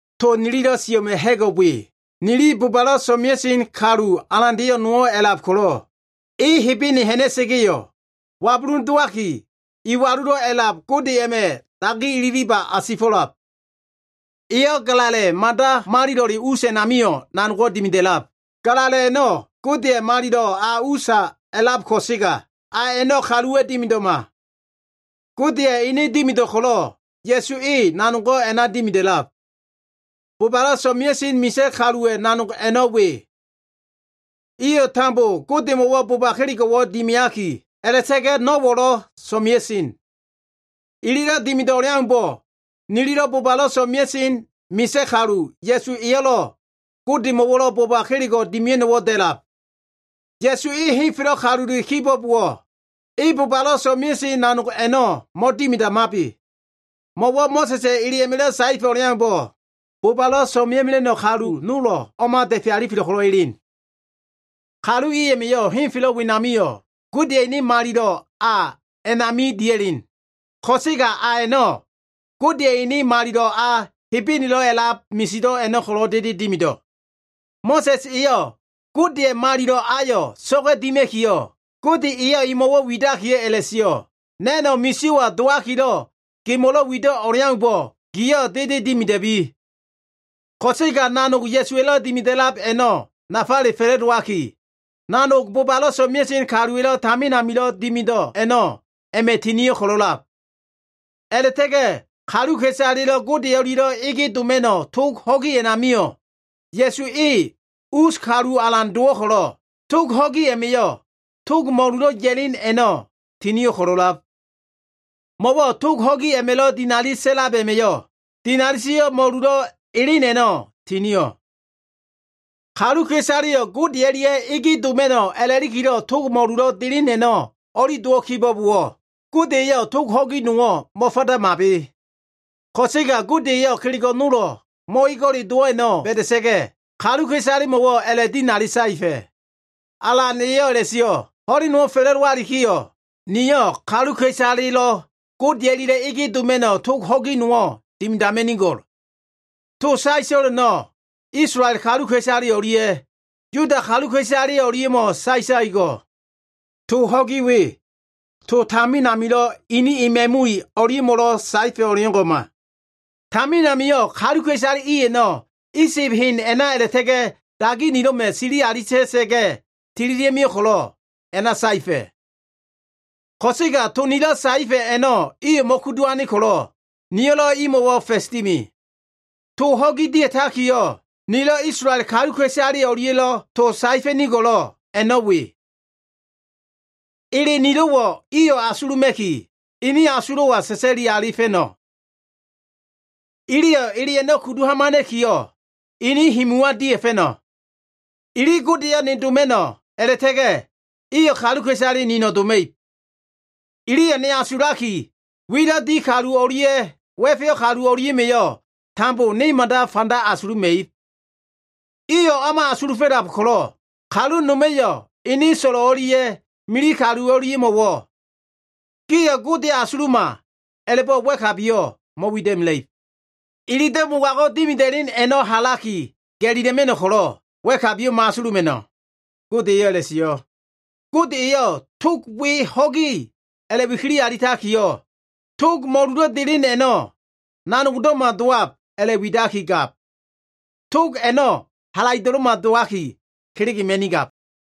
To nililo꞉ sio꞉ a꞉ma꞉ ha꞉go꞉ we. Nili bobalo꞉ so꞉mea꞉sen kalu alandeyo꞉ nowo꞉ a꞉lab ko꞉lo꞉, e Hebene ha꞉na꞉sa꞉ga꞉yo꞉, wabulun dowaki Iwalulo꞉ A꞉lab Gode a꞉ma꞉ dagi ililiba asifo꞉lab. Eyo꞉ Galala꞉ Mada Malilo꞉le us a꞉namio꞉ nanogo꞉ dimida꞉lab. Galala꞉ a꞉no꞉ Godeya꞉ Malilo꞉ a usa a꞉lab ko꞉sega, a a꞉no꞉ kaluwa꞉ dimido꞉ma. Godeya꞉ ene dimido꞉ ko꞉lo꞉, Ya꞉su e nanogo꞉ a꞉na dimida꞉lab. Bobalo꞉ so꞉mea꞉sen misa꞉ kaluwa꞉ nanog a꞉no꞉ we. Iyo꞉ tambo Godemo꞉wo꞉ boba kelego꞉wo꞉ dimiaki, a꞉la꞉ta꞉ga꞉ no꞉wo꞉lo꞉ so꞉mea꞉sen. Ililo꞉ dimido꞉ o꞉leaumbo꞉ nili bobalo꞉ so꞉mea꞉sen misa꞉ kalu Ya꞉su eyo꞉lo꞉ Godemo꞉lo꞉ boba kelego꞉ dimia꞉no꞉wo꞉ da꞉lab. Ya꞉su e henfelo꞉ kalule kibo꞉bowo꞉, e bobalo꞉ so꞉mea꞉sen nanog a꞉no꞉ mo꞉dimidamabe. Mo꞉wo꞉ Mo꞉sa꞉sa꞉ ele a꞉ma꞉lo꞉ saefa꞉ o꞉leaumbo꞉, bobalo꞉ so꞉mea꞉mela꞉no꞉ kalu nolo꞉ o꞉ma da꞉fe alifelo꞉ ko꞉lo꞉ elen. Kalu i a꞉ma꞉yo꞉ henfelo꞉ wenamio꞉ Godeya꞉ ene Malilo꞉ a a꞉nami dia꞉len. Ko꞉sega a a꞉no꞉, Godeya꞉ ene Malilo꞉ a, Hebenelo꞉ a꞉lab misido꞉ a꞉no꞉ ko꞉lo꞉ dede dimido꞉. Mo꞉sa꞉s eyo꞉ Godeya꞉ Malilo꞉ ayo꞉ so꞉ga꞉ dima꞉kiyo꞉, Gode eyo꞉ emo꞉wo꞉ widakiyo꞉ a꞉la꞉sio꞉, “Na꞉no꞉ misio꞉wa dowakilo꞉ gemo꞉lo꞉ wido꞉ o꞉leaumbo꞉ giyo꞉ dede dimida꞉bi.” Ko꞉sega nanogo꞉ Ya꞉suwa꞉lo꞉ dimida꞉lab a꞉no꞉ nafale fa꞉la꞉dowaki, nanog bobalo꞉ so꞉mea꞉sen kaluwa꞉lo꞉ tamin amilo꞉ dimido꞉ a꞉no꞉ a꞉ma꞉ tinio꞉ ko꞉lo꞉lab. A꞉la꞉ta꞉ga꞉ kaluka꞉isalelo꞉ Gode o꞉lia꞉lo꞉ ege doma꞉no꞉ tog ho꞉gi a꞉namio꞉ Ya꞉su e us kalu alan dowo꞉ ko꞉lo꞉, tog ho꞉gi a꞉ma꞉yo꞉ tog mo꞉lulo꞉ ya꞉len a꞉no꞉ tinio꞉ ko꞉lo꞉lab. Mo꞉wo꞉ tog ho꞉gi a꞉ma꞉lo꞉ dinali sa꞉lab a꞉ma꞉yo꞉, dinali sio꞉ mo꞉lulo꞉ elen a꞉no꞉ tinio꞉. Kaluka꞉isaleyo꞉ Gode o꞉lia꞉ ege doma꞉no꞉ a꞉la꞉likilo꞉ tog mo꞉lulo꞉ delen a꞉no꞉ o꞉li dowo꞉ kibo꞉bowo꞉, Gode eyo꞉ tog ho꞉gi nowo꞉ mo꞉fadamabe. Ko꞉sega Gode eyo꞉ kelego꞉ nolo꞉ mo꞉ego꞉le dowo꞉ a꞉no꞉ ba꞉da꞉sa꞉ga꞉, kaluka꞉isalemo꞉wo꞉ a꞉la꞉dinali saefa꞉, “Alan eyo꞉ a꞉la꞉sio꞉, Ho꞉len nowo꞉ fa꞉la꞉dowalikiyo꞉, niyo꞉ kaluka꞉isalelo꞉ Gode o꞉lia꞉lo꞉ ege doma꞉no꞉ tog ho꞉gi nowo꞉ dimidama꞉nigo꞉l. To saeto꞉l a꞉no꞉ Isolael kaluka꞉isale o꞉lia꞉ Yuda kaluka꞉isale o꞉lia꞉mo꞉ saetakigo꞉l. Tog ho꞉gi we, tog tamin amilo꞉ ini ema꞉mui o꞉lia꞉mo꞉lo꞉ saefa꞉ o꞉leo꞉ngo꞉ma. Tamin amio꞉ kaluka꞉isale i a꞉no꞉ Isib hen a꞉na a꞉la꞉ta꞉ga꞉ dagi nilo꞉ma꞉ sili alita꞉sa꞉ga꞉ tililia꞉mio꞉ ko꞉lo꞉ a꞉na saefa꞉. Ko꞉sega to nilo꞉ saefa꞉ a꞉no꞉ iyo꞉ mo꞉kudu ane ko꞉lo꞉, niyo꞉lo꞉ imo꞉wo꞉ fa꞉s dimi. Tog ho꞉gi dia꞉takiyo꞉, nilo꞉ Isolael kaluka꞉isale o꞉lia꞉lo꞉ to saefa꞉nigo꞉lo꞉ a꞉no꞉ we. Ele nilo꞉wo꞉ iyo꞉ asuluma꞉ki, inin asulo꞉wa sa꞉sa꞉li alifa꞉no꞉. Iliyo꞉ ele a꞉no꞉ kudu hamana꞉kiyo꞉, inin himuwa dia꞉fa꞉no꞉. Ili Godeyo꞉ ne doma꞉no꞉ a꞉la꞉ta꞉ga꞉ Iyo꞉ kaluka꞉isale nino꞉ doma꞉ib. Iliyo꞉ ne asulaki, wilo꞉ di kalu o꞉lia꞉ wa꞉feyo꞉ kalu o꞉lia꞉ma꞉yo꞉ tambo ne mada fanda asuluma꞉ib. Iyo꞉ o꞉ma asulufo꞉lab ko꞉lo꞉, kalu noma꞉yo꞉ ene so꞉lo꞉ o꞉lia꞉ mili kalu o꞉lia꞉mo꞉wo꞉ ‘Giyo꞉ Godeyo꞉ asuluma’ a꞉la꞉bo꞉ wa꞉kabiyo꞉ mo꞉wida꞉mela꞉ib. Ililo꞉ mogago꞉ dimida꞉len a꞉no꞉ halaki ga꞉lila꞉ma꞉no꞉ ko꞉lo꞉, wa꞉kabiyo꞉ mo꞉asuluma꞉no꞉,” Gode eyo꞉ a꞉la꞉sio꞉. Gode eyo꞉ tog we “ho꞉gi” a꞉la꞉wikili alitakiyo꞉, tog mo꞉lulo꞉ delen a꞉no꞉ nanogdo꞉ma dowab a꞉la꞉widakigab. Tog a꞉no꞉ halaido꞉lo꞉ma dowaki, kelegema꞉nigab.